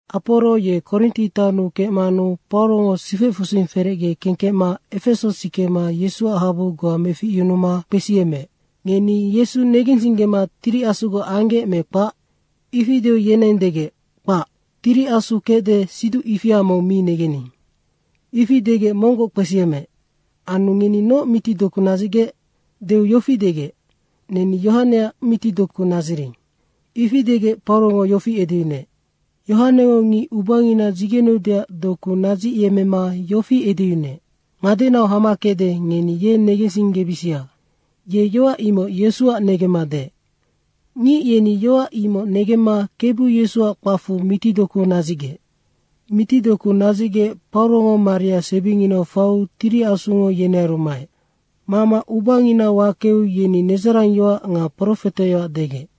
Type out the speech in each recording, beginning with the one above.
Aporo ye Korinti taonnu kecmanu Paurongo sifecfusing ferecge kengkecma Efeso sikema Yesuac habu goa meficyunuma kpesiyemmeec, “Ngeni Yesu negensinggema Tiri Asugoc anggec me kpac?” ifi deu yeneng degec, “Kpac, Tiri Asu kecde, siduc ifia mong mi negening.” Ifi degec monggoc kpesiyemmeec, “Anu ngeni noc mitidoku nadzicgec?” deu yofi degec, “Neni Yohaneac mitidoku nadziring.” Ifi degec Paurongo yofi edeyunuec, “Yohanengo ngic ubangina dzigeneudeac doku nadzicyemmema yofi edeyunuec, ‘Ngadenau hama kecde, ngeni ye negensinggebisia.’ ye yoac imoc Yesuac negemma deec.” Ngic yeni yoac imoc negemma Kebu Yesuac kpacfu mitidoku nadzicgec. Mitidoku nadzicgec Paurongo maria sebinginau faiu Tiri Asungo yenearu maec. Mama ubangina wakeu yeni nedzarangyoac nga profeteyoac degec.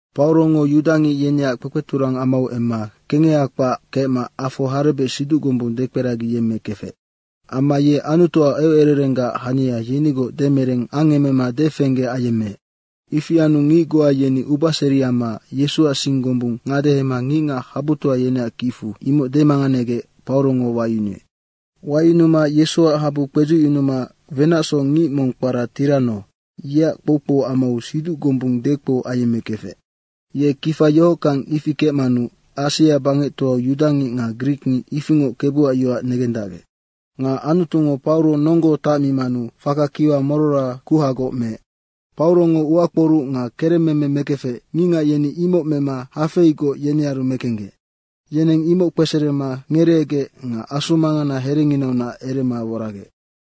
Paurongo yudangic yeneac kpekpeturang amau emma kengeha kpac kecma afo harebec siduc gombung dekperagiyemmekefec. Amma ye Anutuac eucererenggac hania yenigoc demereng angemema defengge ayemmeec. Ifi anu ngic goa yeni ubaseri amma Yesuac sing gombung ngadehema ngicngac habutoa yeneac kicfu imoc demanganegec Paurongo wayunuec. Wayunuma Yesuac habu kpedzucyunuma wenacsoc ngic mong kpara Tirano, yeac kpoukpou amau siduc gombung dekpou ayemmekefec. Ye kifa yohockang ifi kecmanu Asia bangectoau yudangic nga grikngic ifingoc Kebuac yoac negendacgec. Nga Anutungo Pauro nonggo tacmimanu faka kiwa morora kuhagoc meec. Paurongo uakporuc nga keremmeme mekefec, ngicngac yeni imoc mema hafeigoc yenearu mekenggec, yeneng imoc kpeserema ngereegec nga asu mangana herenginaunac erema woragec.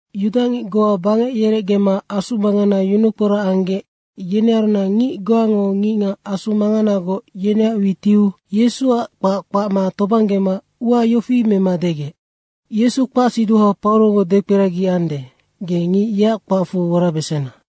Yudangic goa bangec yerecgema asu mangana yunukporac anggec, yenearunac ngic goango ngicngac asu manganagoc yeneac witiu Yesuac kpac kpacma tobanggema ua yofi mema degec, “Yesu kpacsiduha Paurongo dekperagiande, ge ngic yeac kpacfu worabesena.”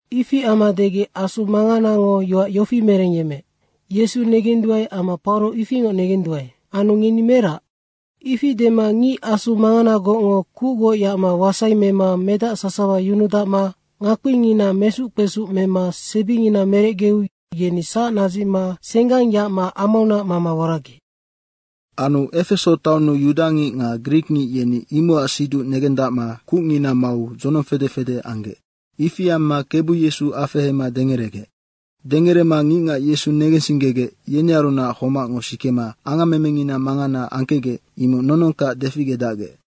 Ifi amma degec asumanganango yoac yofi merengyemmeec, “Yesu negenduae amma Pauro ifingoc negenduae. Anu ngeni merac?” Ifi dema ngic asu manganagocngo kucgoc yacma wasai mema medac sasawa yunudacma ngakpingina mesuc kpesuc mema sebingina merecgeu yeni sac nadzicma senggang yacma amaunac mama woragec. Anu Efeso taonnu yudangic nga grikngic yeni imocac siduc negendacma kucngina mau dzonong fede fede anggec. Ifi amma Kebu Yesu afehema dengeregec. Dengerema ngicngac Yesu negensinggegec, yenearunac homacngo sikema angammemengina mangana angkecgec, imoc nonongkac deficgedacgec.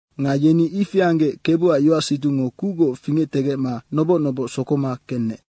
Nga yeni ifi anggec Kebuac yoacsiducngo kucgoc fingectegecma noboc noboc sokoma kenec.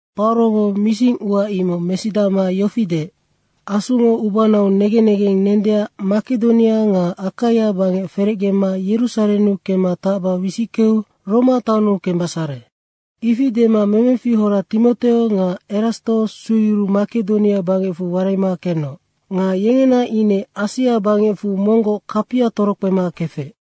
Paurongo mising ua imoc mesidacma yofi deec, “Asungo ubanau negen negeng nendeac Makedonia nga Akaia bangec ferecgema Yerusarennu kemma tacba wisickeu Roma taonnu kembesare.” Ifi dema memefihora Timoteo nga Erasto sueyuruu Makedonia bangecfu waraima kenoc. Nga yengena ine Asia bangecfu monggoc kapia torokpema kefec.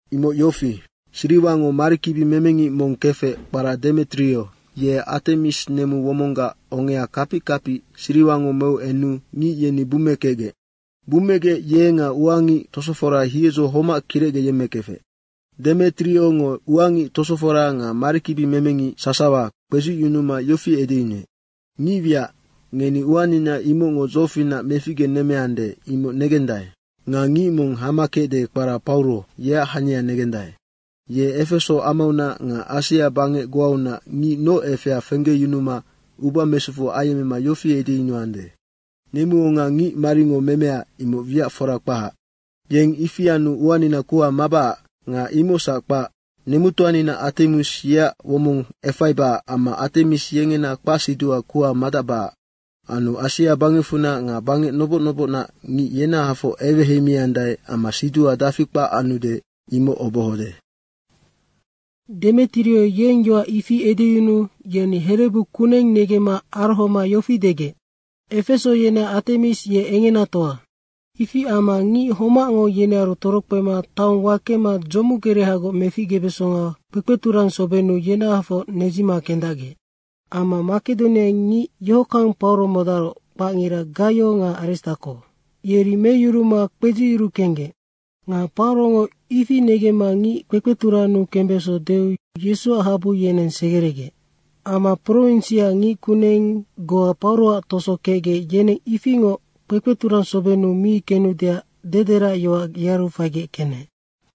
Imoc yofi: Siriwango marikibimemengic mong kefec kpara Demetrio, yeng Atemis nemu womonggac ongea kapic kapic siriwango meu enu ngic yeni bummekecgec. Bummegec ye nga ua ngic tosofora hiedzo homac kirecgeyemmekefec. Demetriongo ua ngic tosofora nga marikibimemengic sasawa kpedzucyunuma yofi edeyunuec, “Ngicwiac, ngeni uanina imocngo dzofinac meficgenemmeande, imoc negendae. Nga ngic mong hama kecde kpara Pauro, yeac hania negendae. Ye Efeso amaunac nga Asia bangec goaunac ngic noc efea fenggeyunuma uba mesufu ayemmema yofi edeyunuande, ‘Nemuonga ngicmaringo memea, imoc wiac fora kpahac.’ Yeng ifi anu uanina kuha mabacac nga imocsac kpac. Nemutoanina Atemis yeac womong efaibacac amma Atemis yengena kpacsiduha kuha madacbacac. Anu Asia bangecfunac nga bangec noboc nobocnac ngic yenahafoc eweheimiandae amma siduha dafi kpac anude, imoc obohode.” Demetrio yeng yoac ifi edeyunuu yeni herebu kuneng negemma arohoma yofi degec, “Efeso yeneac Atemis ye engenatoa!” Ifi amma ngic homacngo yenearu torokpema taong wakema dzomu gerehagoc meficgebesonga kpekpeturangsobennu yenahafoc nedzima kendacgec. Amma Makedonianac ngic yohockang Pauro modaroc, kpacngira Gaio nga Aristako, yeri meyuruma kpedziyuru kenggec. Nga Paurongo ifi negemma ngic kpekpeturannu kembeso deu Yesuac habu yeneng segeregec. Amma prowinsiac ngickuneng goa Pauroac toso kecgec, yeneng ifingoc kpekpeturang sobennu mi kenudeac dederacyoac yearu faigec kenec.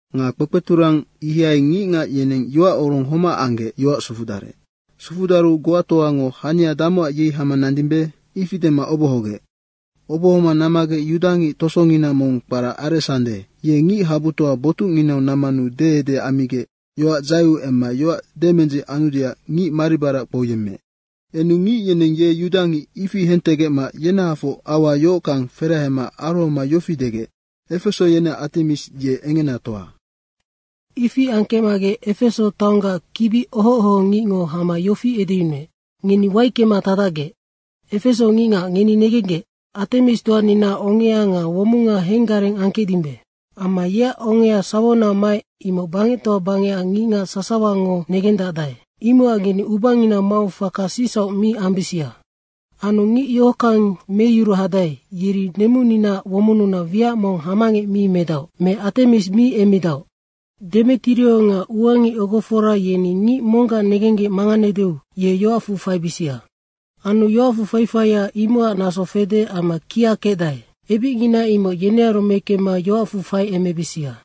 Nga kpekpeturang ihai ngicngac yeneng yoacorong homac anggec yoac sufudarec. Sufudaru goatoango “Hania damocac yei hama nandimbe?” ifi dema obohogec. Obohoma nammagec yudangic tosongina mong kpara Aresande, ye ngichabutoa botucnginau nammanu deede ammigec yoac dzaeu emma yoac demendzic anudeac ngic maribarac kpouyemmeec. Enu ngic yeneng ye yudangic, ifi hentegecma yenahafoc aua yohockang ferahema arohoma yofi degec, “Efeso yeneac Atemis ye engenatoa.” Ifi angkecmagec Efeso taonggac kibi oho ohongicngo hama yofi edeyunuec, “Ngeni waickema tacdacgec! Efeso ngicngac ngeni negenggec, Atemistoaninaac ongea nga womonga henggareng angkecdimbe. Amma yeac onga sawaunac maec, imoc bangectoa bangecac ngicngac sasawango negendacdae. Imocac ngeni ubangina mau faka sicsauc mi ambisia. Anu ngic yohockang meyuru hadae, yeri nemuninaac womonnunac wiac mong hamangec mi medaoc me Atemis mi emmidaoc. Demetrio nga ua ngic ogofora yeni ngic monggac negenggec manganedeu ye yoacfu faibisia. Anu yoacfu faifaia, imocac naso fede amma kia kecdae. Ebicngina imoc yenearu mekemma yoacfu faiemebisia.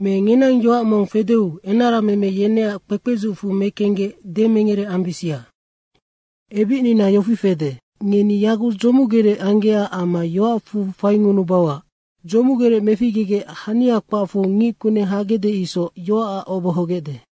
Me ngenang yoac mong fedeu enarameme yeneac kpekpedzucfu mekenggec demengere ambisia. Ebicnina yofi fede, ngeni yaguc dzomugerec anggecac amma yoacfu fainunubauac. Dzomugerec meficgegec hania kpacfu ngickuneng hagecde isoc yoacac obohogecde.”